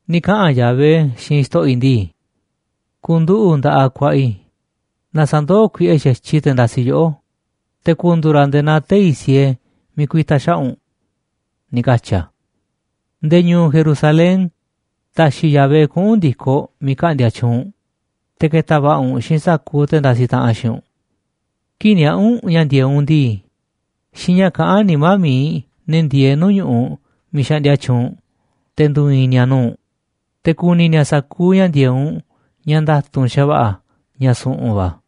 Ni̱ kaꞌa̱n Yahvé xiinꞌ Xto̱ꞌo̱ i̱ ndii: “Ku̱nduꞌu̱ꞌ nda̱ꞌaꞌ ku̱a̱ꞌa̱ i̱ na sa̱ndoó kuiꞌe xa̱tyiꞌ i̱ te̱ ndasiꞌ yoꞌó, te̱ ku̱ndu̱u̱ ra̱ nde̱e̱ naa tei̱ siee miiꞌ ku̱i̱ta̱ xaꞌa̱ꞌ u̱nꞌ”, ni̱ katyi̱ a̱. Nde̱e̱ ñu̱u̱ Jerusalén ta̱xi̱ Yahvé kuꞌu̱n ndi̱koꞌ miiꞌ ka̱ꞌndi̱a̱ tyuunꞌ u̱nꞌ, te̱ ke̱ta̱ va̱ꞌa̱ u̱nꞌ xiinꞌ sa̱kuuꞌ te̱ ndasiꞌ taꞌanꞌ xiinꞌ u̱nꞌ. Kii̱ꞌ niaꞌa̱ u̱nꞌ ña̱ ndi̱e̱eꞌ u̱nꞌ ndii, xiinꞌ ña̱ kaꞌán nimá mi̱iꞌ ne̱ ndieeꞌ nuu̱ꞌ ñu̱ꞌuꞌ miiꞌ xaꞌndia tyuunꞌ u̱nꞌ, te̱ ndu̱u̱ i̱i̱n ni̱a̱ nuu̱ꞌ u̱nꞌ. Te̱ ku̱ni̱ ni̱a̱ sa̱kuuꞌ ña̱ ndi̱e̱eꞌ u̱nꞌ ña̱ nda̱tu̱nꞌ xa̱va̱ꞌa̱ ña̱ su̱ꞌu̱n va̱.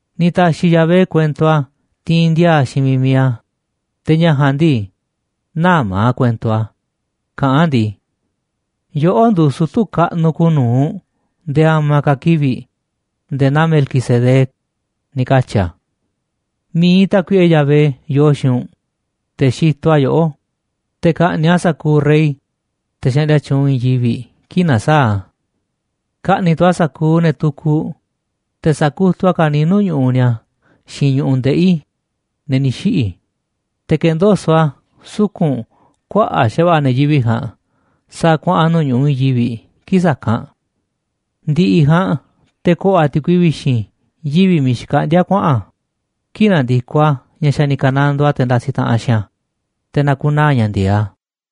Ni̱ ta̱xi̱ Yahvé kuento a̱ tiinꞌ ndiaa xiinꞌ miiꞌ mi̱iꞌ a̱, te̱ ña̱ ja̱a̱nꞌ ndii, nä̱ma̱ a̱ kuento a̱ kaꞌán a̱ ndii: “Yoꞌó nduuꞌ sutu̱ kaꞌnuꞌ kuuꞌ nu̱uꞌ nde̱e̱ a̱ma̱ ka̱ kivi̱ꞌ nde̱e̱ naa Melquisedec”, ni̱ katyi̱ a̱. Mi̱iꞌ Tákuiꞌe Yahvé yoo xiinꞌ u̱nꞌ, te̱ xitoꞌ a̱ yoꞌó, te̱ ka̱ꞌni̱ꞌ a̱ sa̱kuuꞌ rey, te̱ xaꞌndia tyuunꞌ i̱i̱n yivi̱ꞌ, kii̱ꞌ na̱saa̱ꞌ a̱. Ka̱ꞌni̱ꞌ tu̱ a̱ sa̱kuuꞌ ne̱ tukuꞌ, te̱ sa̱kutuꞌ a̱ ka̱niiꞌ nuu̱ꞌ ñu̱ꞌuꞌ ni̱a̱ xiinꞌ ñu̱ꞌuꞌ ndeꞌi̱, ne̱ ni̱ xiꞌi̱, te̱ ke̱ndoso̱ꞌ a̱ suku̱nꞌ kuaꞌa̱ꞌ xa̱va̱ꞌa̱ ne̱ yivi̱ꞌ ja̱a̱nꞌ, sa̱a̱ kuaꞌa̱n nuu̱ꞌ ñu̱ꞌuꞌ i̱i̱n yivi̱ꞌ kii̱ꞌ sa̱kanꞌ. Ndi̱ꞌi̱ ja̱a̱nꞌ te̱ ko̱ꞌo̱ a̱ ti̱kui vi̱xi̱n yivi̱ miiꞌ xkaꞌndi̱a̱ a̱ kuaꞌa̱n a̱, kii̱ꞌ na̱ndi̱koꞌ a̱ ña̱ xa̱ ni̱ ka̱nandoo a̱ te̱ ndasiꞌ taꞌanꞌ xiinꞌ a̱, te̱ na̱ku̱naa̱ ña̱ ndi̱e̱eꞌ a̱.